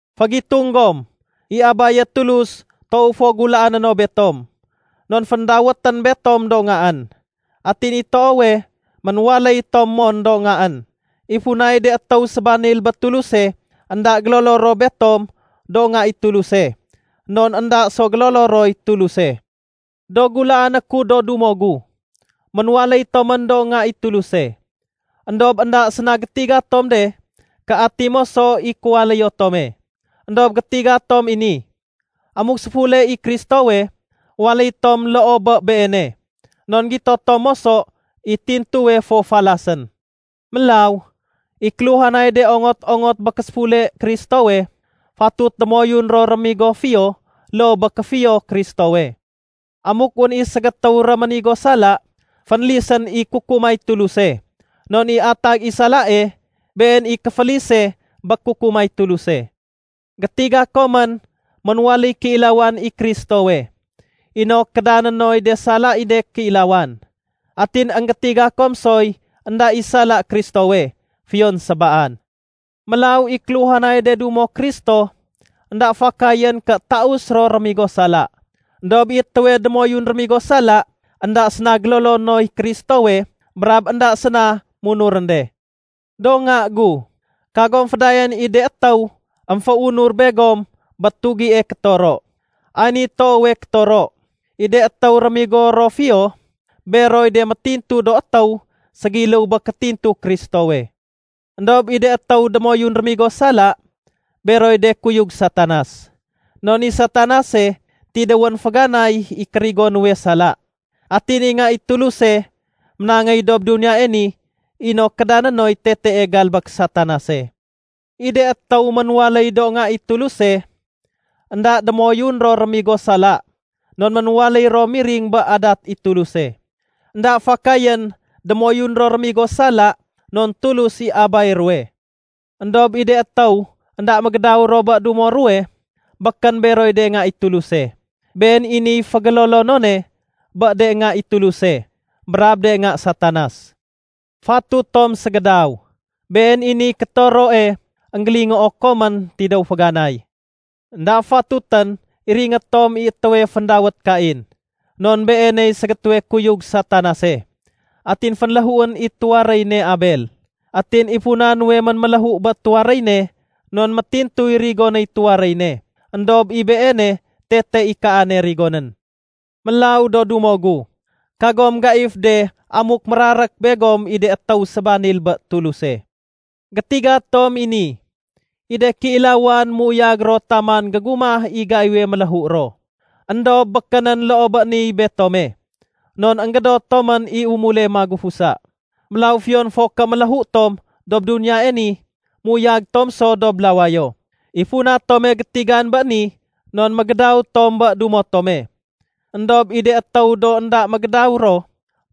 Fégitung gom, i Abaye Tulus toow fo gulaané no betom! Non féndawétén betom do ngaén. Atin i toowe, ménwaléy tom mon do ngaén. I funay de étéw sébanil bé Tuluse énda gélolo ro betom do nga i Tuluse, non énda so gélolo roy Tuluse. Do gulaané ku do dumo gu, ménwaléy tomén do nga i Tuluse. Endob énda séna gétiga tom de ké ati moso i kéwaléyo tome. Endob gétiga tom i ni: Amuk séfule i Kristowe, waléy tom loo bé Beene, non gito tom moso i tintuwe fo falasén. Mélaw, i kéluhanay de ongot-ongot bé késéfule Kristowe, fatut démoyun ro rémigo fiyo loo bé kéfiyo Kristowe. Amuk wén i ségétéw réménigo sala, fénlisén i kukumay Tuluse, non i atag i salae, been i kéfélise bé kukumay Tuluse. Gétiga komén ménwaléy kéilawan i Kristowe inok kédané noy de sala i de kéilawan. Atin énggétiga kom soy énda i sala Kristowe, fiyon sébaan. Mélaw i kéluhanay de dumo Kristo, énda fakayén ké taus ro rémigo sala. Endob i étéwe démoyun rémigo sala énda séna gélolo noy Kristowe brab énda séna munurén de. Do nga gu, kagom fédayaén i de étéw émféunur begom bé tugie kétoro. Ay niy toowe kétoro: I de étéw rémigo ro fiyo, beroy de métintu do étéw ségiléw bé kétintu Kristowe. Endob i de étéw démoyun rémigo sala, beroy de kuyug Satanas. Non i Satanase tidéwén féganay i kérigo nuwe sala. Atin i Nga i Tuluse ménangéy dob duniyae ni inok kédané noy tetee galbék Satanase. I de étéw ménwaléy do nga i Tuluse, énda démoyun ro rémigo sala non ménwaléy ro miring bé adat i Tuluse. Enda fakayén démoyun ro rémigo sala non Tulus i Abay ruwe. Endob i de étéw énda mégédaw ro bé dumo ruwe, békén beroy de nga i Tuluse. Been i niy fégélolonone bé de nga i Tuluse brab de nga Satanas. Fatut tom ségédaw. Been i niy kétoroe énggélingoo komén tidéw féganay. Enda fatutén iringé tom i étéwe féndawét Kain. Non beeney ségétéwe kuyug Satanase, atin fénléhuén i tuwaréy ne Abel. Atin i funa nuwe ménméléhu bé tuwaréy ne non métintuy rigonéy tuwaréy ne, éndob i beene tete i kaane rigonén. Mélaw do dumo gu, kagom mégaif de amuk mérarék begom i do étéw sébanil bé Tuluse. Gétiga tom i ni: I de kéilawan méuyag ro taman gégumah i gaiwe méléhu ro. Endob békénén loo bé niy betome, non énggédot tomén i umule magufusa. Mélaw fiyon fo ké méléhu tom dob duniyae ni, méuyag tom so dob lawayo. I funa tome gétigan bé ni non mégédaw tom bé dumo tome. Endob i de étéw do énda mégédaw ro,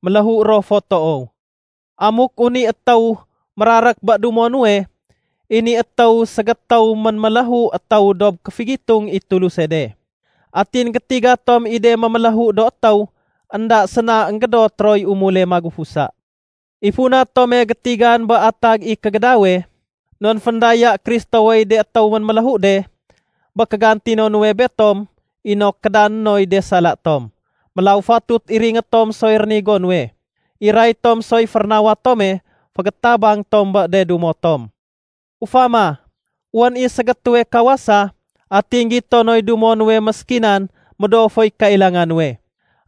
méléhu ro fo toow. Amuk wén i étéw mérarék bé dumo nuwe, i ni étéw ségétéw ménméléhu étéw dob kéfégitung i Tuluse de. Atin gétiga tom i de méméléhu do étéw énda séna énggédot roy umule magufusa. I funa tome gétigan bé atag i “kégédawe” non féndaya Kristowey de étéw ménméléhu de bé kégantino nuwe betom inok kédané noy de sala tom. Mélaw fatut iringé tom soy rénigo nuwe. Iray tom soy férénawa tome fégétabang tom bé de dumo tom. Ufama, wén i ségétéwe kawasa, atin gito noy dumo nuwe méskinan médoo foy kailanga nuwe.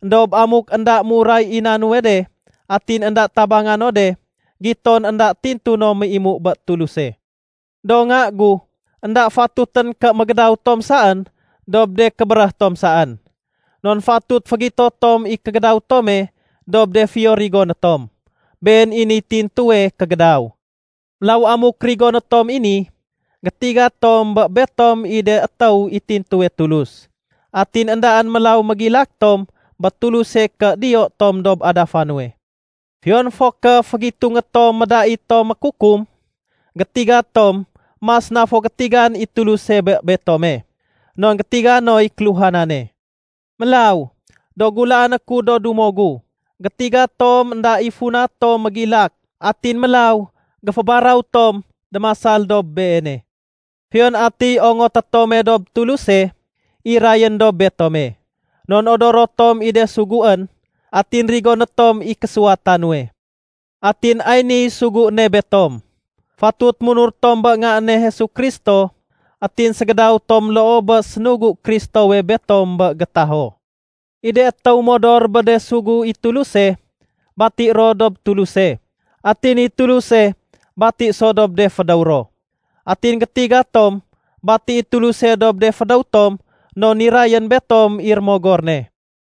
Endob amuk énda méuray i na nuwe de atin énda tabanga no de, giton énda tintu no méimu bé Tuluse. Do nga gu, énda fatutén ké mégédaw tom saén dob de kébéréh tom saén. Non fatut fégito tom i kégédaw tome dob de fiyo rigoné tom. Been i niy tintuwe kégédaw. Mélaw amuk rigoné tom i ni, gétiga tom bé betom i de étéw i tintuwe Tulus. Atin éndaén mélaw mégilak tom bé Tuluse ké diyo tom dob adafa nuwe. Fiyon fo ké fégitungé tom médait tom mékukum, gétiga tom mas na fo gétigan i Tuluse bé betome, non gétiga noy kéluhanane. Mélaw, do gulaané ku do dumo gu, gétiga tom énda i funa tom mégilak, atin mélaw géfébaraw tom démasal dob beene. Fiyon atiy ongoté tome dob Tuluse, irayén dob betome. Non odoro tom i de suguén, atin rigoné tom i késuwata nuwe. Atin ay niy sugu ne betom: Fatut munur tom bé Nga ne Jesu Kristo atin ségédaw tom loo bé sénugu Kristowe betom bé gétaho. I de étéw modor bé de sugu i Tuluse, bati ro dob Tuluse, atin i Tuluse bati so dob de fédéw ro. Atin gétiga tom bati i Tuluse dob de fédéw tom non nirayén betom i Rémogor ne.